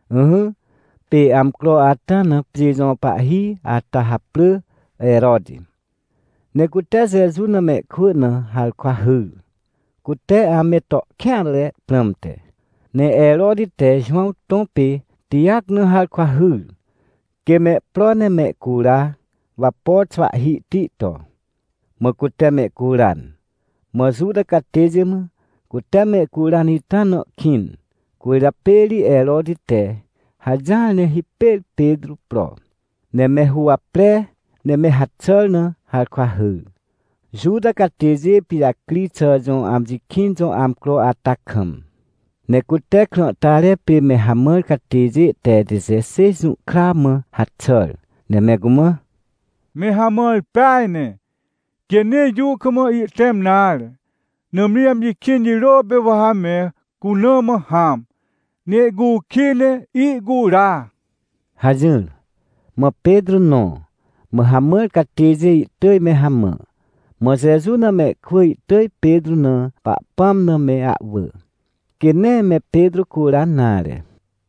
Ỹhỹ, pê amcro ata na pjê jõ pahhi ata haprỳ Heroti, ne cute Jeju na mehkwỳ na harkwa hyr, cute ame to kêanre prãmte. Ne Heroti te Jowãw tõ pê Tijac na harkwa hyr, quê mehpro ne mehcura, wapo xwahhihti to. Mã cute mehcuran. Mã Juta catêjê mã cute mehcuran ita na kĩn. Cwỳrjapê ri Heroti te hajỹar ne hipêr Petrô pro, ne me huwapre ne me haxàr na harkwa hyr, Juta catêjê pijacri xà jõ amji kĩn jõ amcro ata kam. Ne cute krãhtare pê me hamãr catêjê te tejixêj jũhkra mã haxàr, ne me cumã: — Me hamãr peaj ne, quê nee jũ kam ihtẽm nare, nãmri amji kĩn jirô pê wa ha me cuna mã hãm, ne ihcukij, ne ihcura — hajỹr. Mã Petrô nõ, mã hamãr catêjê ihtỳj me hamã. Mã Jeju na mehkwỳ ihtỳj Petrô na Pahpãm na me ahwỳ, quê nee me Petrô curan nare.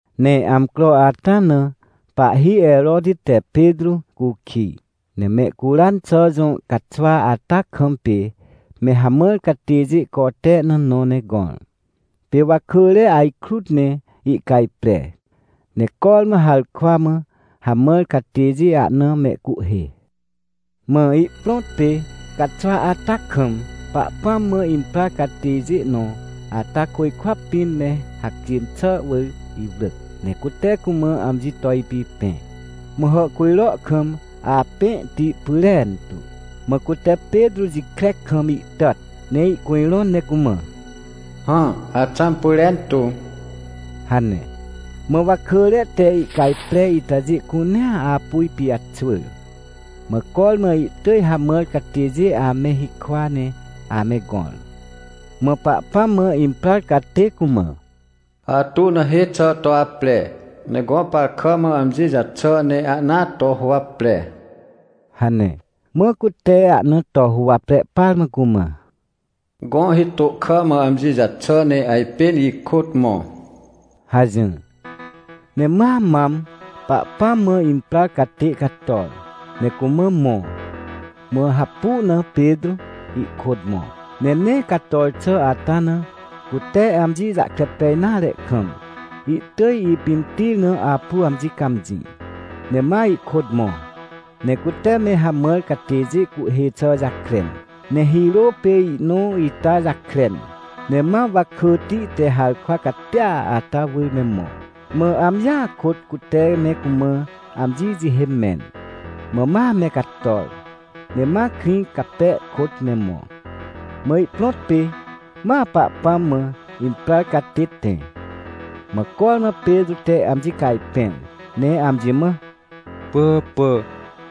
Ne amcro ata na pahhi Heroti te Petrô cukij, ne mehcuran xà jõ caxwa ata kam pê me hamãr catêjê cote na nõ ne gõr. Pê wakỳre ajkrut ne ihcajpre, ne cormã harkwa mã hamãr catêjê ahna mehcuhhê. Mã ihprõt pê caxwa ata kam, Pahpãm mã imprar catêjê nõ ata côjkwa pĩn me hacjên xà wỳr iwrỳc, ne cute cumã amji to ipipẽ. Mã hàhcujro kam apẽhti pyrentu. Mã cute Petrô jikre kam ihtàt, ne ihcujrõn ne cumã: — Hã, axãm pyrentu — hane. Mã wakỳre te ihcajpre itajê cunea apu ipijaxwỳr. Mã cormã ihtỳj hamãr catêjê ame hikwa ne ame gõr. Mã Pahpãm mã imprar catê cumã: — Atu na hê xà to apre, ne gõ par kà mã amji jaxà ne ahna to huwapre — hane. Mã cute ahna to huwapre par mã cumã: — Gõ hitô kà mã amji jaxà ne ajpên ikôt mõ — hajỹr. Ne ma mam Pahpãm mã imprar catê cator, ne cumã mõ, mã hapu na Petrô ihkôt mõ. Ne nee cator xà ata na cute amji jahkre pej nare kam, ihtỳj ipimtir na apu amji cãmjĩ. Ne ma ihkôt mõ, ne cute me hamãr catêjê cuhhê xà jakren, ne hirô pê ihnõ ita jakren, ne ma wakỳti te harkwa catia ata wỳr me mõ. Mã amjia kôt cute me cumã amji jihê mẽn, mã ma me cator. Ne ma krĩ cape kôt me mõ, mã ihprõt pê ma Pahpãm mã imprar catê tẽ. Mã cormã Petrô te amji cajpẽr ne amji mã: — Pỳhàpà,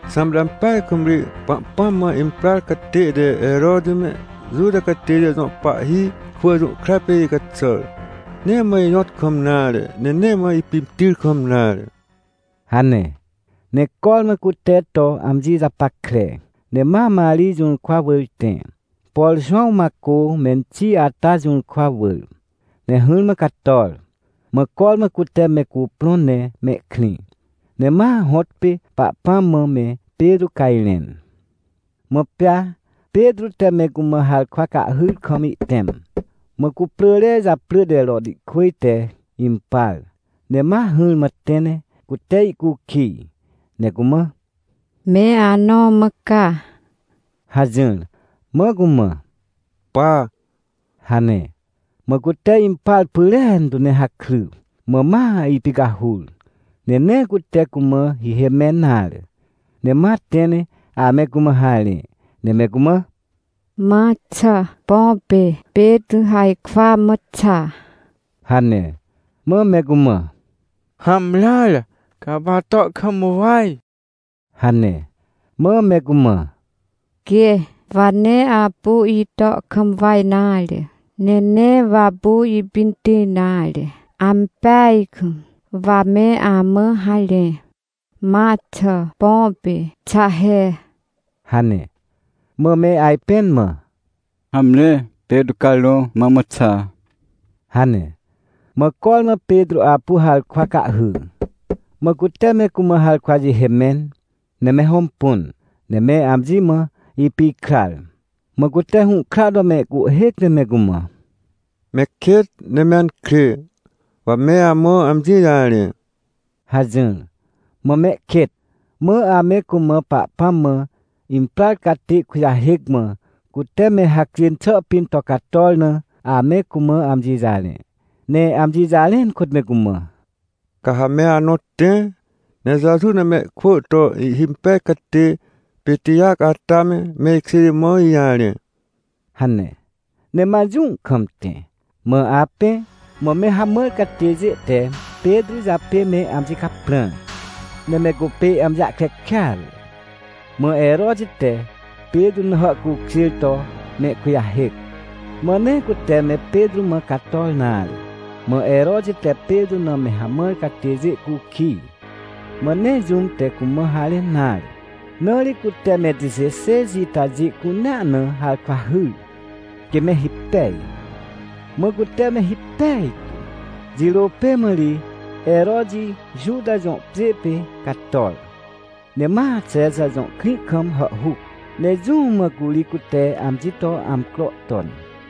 xãmte ampeaj kam ri Pahpãm mã imprar catê te Heroti me, Juta catêjê jõ pahhi kwỳ jũhkra pê icaxàr! Nee mã ijõt kam nare, ne nee mã ipimtir kam nare — hane. Ne cormã cute to amji japackre, ne ma Marij jũrkwa wỳr tẽ, por Jowãw Macô menxi ata jũrkwa wỳr. Ne hỹrmã cator, mã cormã cute me cuprõn ne mehkrĩ, ne ma hõtpê Pahpãm mã me Petrô cajrẽn. Mã pea Petrô te me cumã harkwa cahhyr kam ihtẽm. Mã cuprỳre japrỳ te Rotihkwỳj te impar, ne ma hỹrmã tẽ ne cute ihcukij, ne cumã: — Me anõ mã ca? — hajỹr. Mã cumã: — Pa — hane. Mã cute impar pyrentu ne hakry mã ma ipicahur, ne nee cute cumã hihê mẽn nare, ne ma tẽ ne ame cumã harẽ, ne me cumã: — Ma xà, põ pê Petrô harkwa mã xa — hane. Mã me cumã: — Hamreare, ca apu ato kam waj — hane. Mã me cumã: — Quê, wa nee apu ito kam waj nare, ne nee wa apu ipimtir nare, ampeaj kam wa me amã harẽ. Ma xà, põ pê xa he! — hane. Mã me ajpẽn mã: — Hamre, Petrô carõ mõrmõ xa — hane. Mã cormã Petrô apu harkwa cahhy, mã cute me cumã harkwa jihê mẽn, ne me hõmpun, ne me amji mã ipikrar. Mã cute hũhkra to mehcuhhêc ne me cumã: — Me kêt, ne me ankrê, wa me amã amji jarẽ — hajỹr. Mã me kêt, mã ame cumã Pahpãm mã imprar catê kujahêc, mã cute me hacjên xà pĩn to cator na, ame cumã amji jarẽ. Ne amji jarẽn kôt me cumã: — Ca ha me anõ tẽ, ne Jeju na mehkwỳ to ihhimpej catê, pê Tijac ata me, me ikjêjê mã ijarẽ — hane. Ne ma jũ kam tẽ. Mã apẽ, mã me hamãr catêjê te Petrô japê me amji caprãr, ne me cupê amji jahkre kêatre. Mã Heroti te Petrô na hàhcukjêr to mehkujahêc. Mã nee cute me Petrô mã cator nare, mã Heroti te Petrô na me hamãr catêjê cukij, mã nee jũm te cumã harẽn nare. Na ri cute me tejixêj itajê cunea na harkwa hyr, quê me hipej, mã cute me hipej tu. Jirô pê mã ri, Heroti Juta jõ pjê pê cator, ne ma Xexa jõ krĩ kam hàhhuc, ne jũ mã curi cute amji to amcro ton.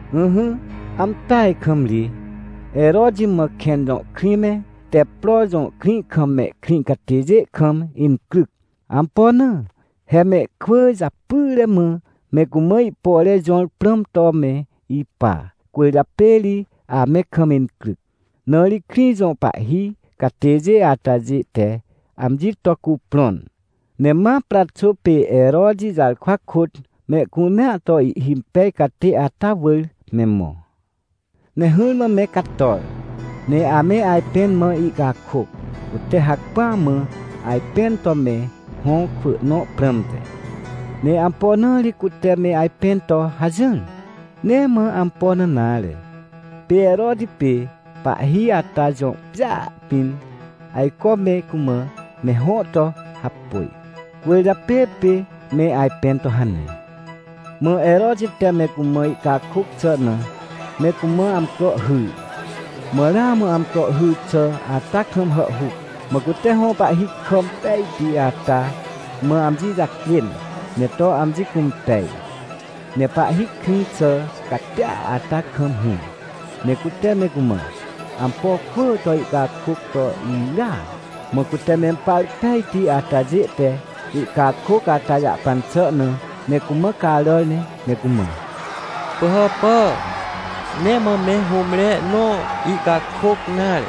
Ỹhỹ, ampeaj kam ri, Heroti mã Kẽn jõ krĩ me Teppro jõ krĩ kam mehkrĩ catêjê kam incryc. Ampo na? He mehkwỳ japyre mã me cumã ihpore jõr prãm to me ipa, cwỳrjapê ri ame kam incryc. Na ri krĩ jõ pahhi catêjê atajê te amji to cuprõn, ne ma Praxô pê Heroti jarkwa kôt mehcunea to ihhimpej catê ata wỳr me mõ. Ne hỹrmã me cator, ne ame ajpẽn mã ihcakôc, cute hacpỹa mã ajpẽn to me hõ kwỳ nõ prãmte. Ne ampo na ri cute me ajpẽn to hajỹr? Nee mã ampo na nare. Pê Heroti pê pahhi ata jõ pjêa pĩn ajco me cumã me hõ to hapôj, cwỳrjapê pê me ajpẽn to hane. Mã Heroti te me cumã ihcakôc xà na me cumã amcro hyr, mã ramã amcro hyr xà ata kam hàhhuc. Mã cute hõ pahhi kà impejti ata mã amji jacjên ne to amji cũmpej, ne pahhi krĩ xà catia ata kam hỹr, ne cute me cumã ampo kwỳ to ihcakôc to irya. Mã cute mempar pejti atajê te ihcakôc ata jahpan xà na me cumã caràr ne me cumã: — Pỳhàpà, nee mã me hũmre nõ ihcakôc nare!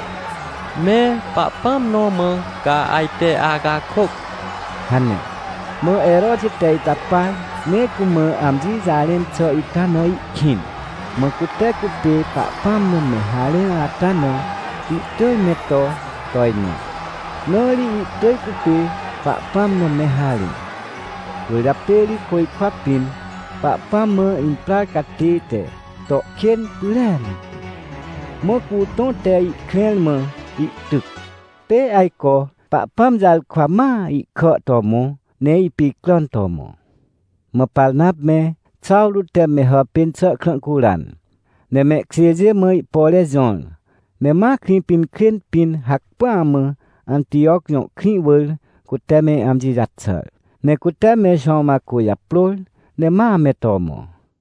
Me pahpãm nõ mã ca ajte acakôc! — hane. Mã Heroti te ita par, ne cumã amji jarẽn xà ita na ihkĩn. Mã cute cupê Pahpãm na me harẽn ata na, ihtỳj me to tojnõ, na ri ihtỳj cupê Pahpãm na me harẽ. Cwỳrjapê ri côjkwa pĩn Pahpãm mã imprar catê te to kên pyrentu. Mã cutõ te ihkrẽr mã ihtyc. Pê ajco Pahpãm jarkwa ma ihkà to mõ, ne ipicràn to mõ. Mã Parnap me, Xawrô te me hàpên xà krã curan, ne mehkjêjê mã ihpore jõr, ne ma Krĩpinkrên pĩn hacpỹa mã Antijoc jõ krĩ wỳr cute me amji jaxàr. Ne cute me Jowãw Macô japrôr ne ma me to mõ.